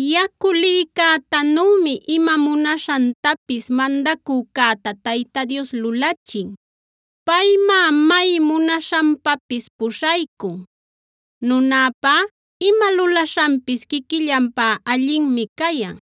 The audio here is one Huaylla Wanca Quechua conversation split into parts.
Yacu lïcätanümi ima munaśhantapis mandacücäta Tayta Dios lulachin; paymá may munaśhanpapis puśhaycun. Nunäpá ima lulaśhanpis quiquillanpá allinmi cayan;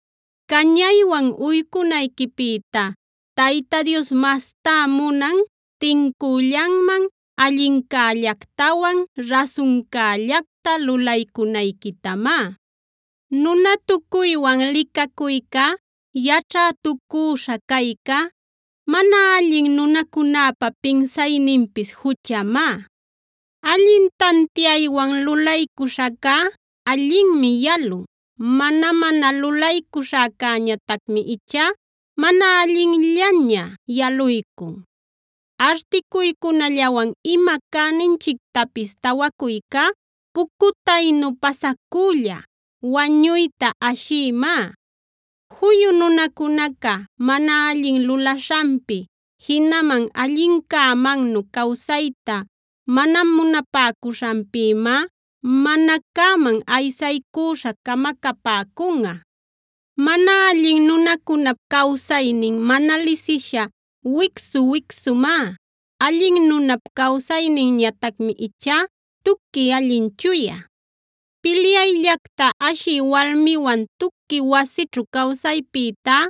Cañaywan uycunayquipïta Tayta Dios mastá munan tincüllanman allincällactawan rasuncällacta lulaycunayquitamá.b Nunatucuywan licacuyca, yaćhätucüśha cayca, mana allin nunacunäpa pinsayninpis juchamá. Allin tantiaywan lulaycuśhacá allinmi yalun; mana-mana lulaycuśhacäñatacmi ichá mana allinllaña yaluycun. Articuycunallawan ima cäninchictapis tawacuycá pucutaynu pasacülla, wañuyta ashiymá. Juyu nunacunaca mana allin lulaśhanpi jinaman allincämannu cawsayta mana munapäcuśhanpïmá mana cäman aysaycüśha camacapäcunꞌa. Mana allin nunacunap cawsaynin mana lisisha wicsu-wicsumá; allin nunap cawsayninñatacmi ichá tuqui allin chuya. Pilyayllacta ashï walmiwan tuqui wasićhu cawsaypïtá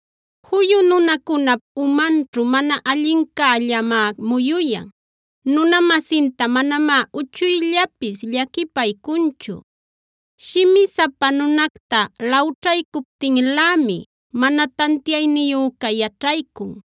Juyu nunacunap umanćhu mana allincällamá muyuyan; nuna-masinta manamá uchuyllapis llaquipaycunchu. Shimisapa nunacta lawćhaycuptinlämi, mana tantiayniyüca yaćhaycun;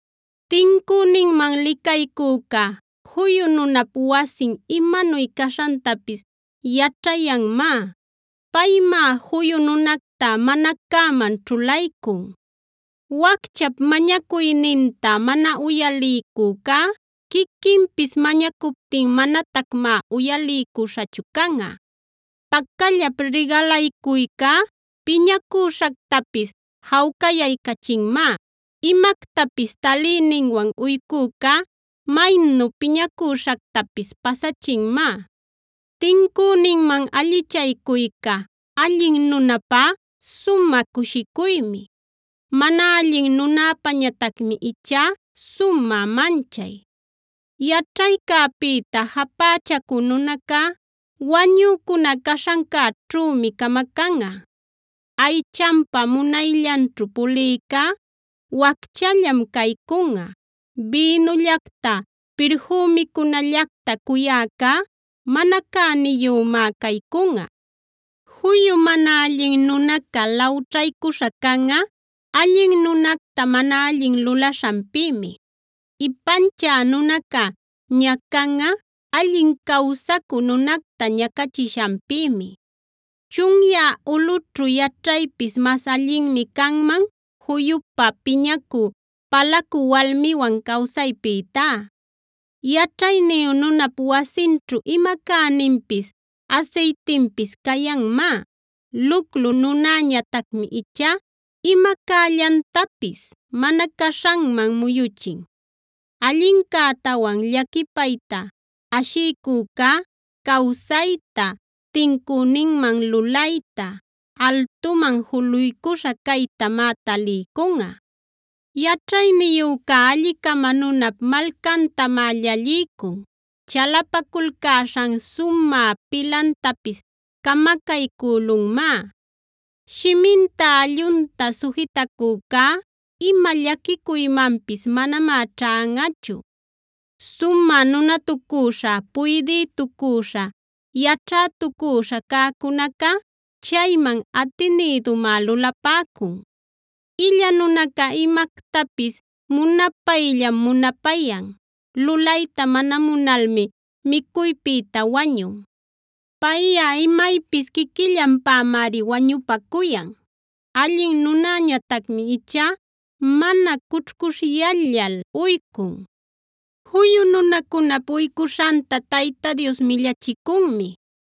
Tincüninman Licaycücaf juyu nunap wasin imanuy caśhantapis yaćhayanmá; paymá juyu nunacta mana cäman ćhulaycun. Wacchap mañacuyninta mana uyaliycücá, quiquinpis mañacuptin manatacmá uyaliycuśhachu canꞌa. Pacallap rigalaycuycá piñacüśhactapis jawcayaycachinmá; imactapis taliyninwan uycücá maynu piñacüśhactapis pasachinmá. Tincüninman allichaycuyca allin nunäpá sumä cushicuymi; mana allin nunäpäñatacmi ichá sumä manchay. Yaćhaycäpïta japächacü nunacá wañücuna caśhancäćhümi camacanꞌa. Aychanpa munayllanćhu pulïcá wacchallam caycunꞌa; bïnullacta, pirfümicunallacta cuyäcá mana cäniyümá caycunꞌa. Juyu mana allin nunaca lawćhaycuśha canꞌa, allin nunacta mana allin lulaśhanpïmi. Ipanchä nunaca ñacanꞌa allin cawsaycü nunacta ñacachishanpïmi. Chunyä ulꞌućhu yaćhaypis mas allinmi canman juyupä piñacü, palacü walmiwan cawsaypïtá. Yaćhayniyu nunap wasinćhu ima cäninpis asaytinpis cayanmá; luclu nunäñatacmi ichá ima cällantapis mana caśhanman muyuchin. Allincätawan llaquipayta ashiycücá cawsayta, tincüninman lulayta, altuman juluycuśha caytamá taliycunꞌa. Yaćhayniyüca alli-cama nunap malcantamá llalliycun; chalapaculcäśhan sumä pilantapis camacaycülunmá. Shiminta allunta sujitacücá ima llaquicuymanpis manamá ćhanꞌachu. Sumä nunatucüśha, puydïtucüśha, yaćhätucüśha cäcunaca chayman atinïdumá lulapäcun. Illa nunaca imactapis munapayllam munapayan; lulayta mana munalmi micuypïta wañun. Payꞌa imaypis quiquillanpämari wañupacuyan; allin nunäñatacmi ichá mana cućhcuśhyallal uycun. Juyu nunacunap uycuśhanta Tayta Dios millachicunmi;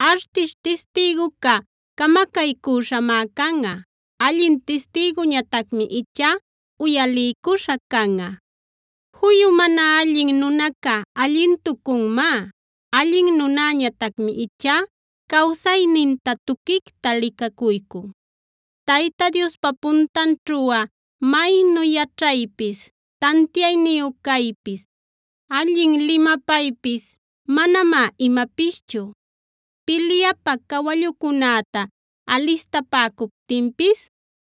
Artish tistïguca camacaycüśhamá canꞌa; allin tistïguñatacmi ichá uyaliycuśha canꞌa. Juyu mana allin nunaca allintucunmá; allin nunäñatacmi ichá cawsayninta tuquicta licacuycun. Tayta Diospa puntanćhuꞌa maynu yaćhaypis, tantiayniyu caypis, allin limapaypis manamá imapischu. Pilyapä cawallucunäta alistapäcuptinpis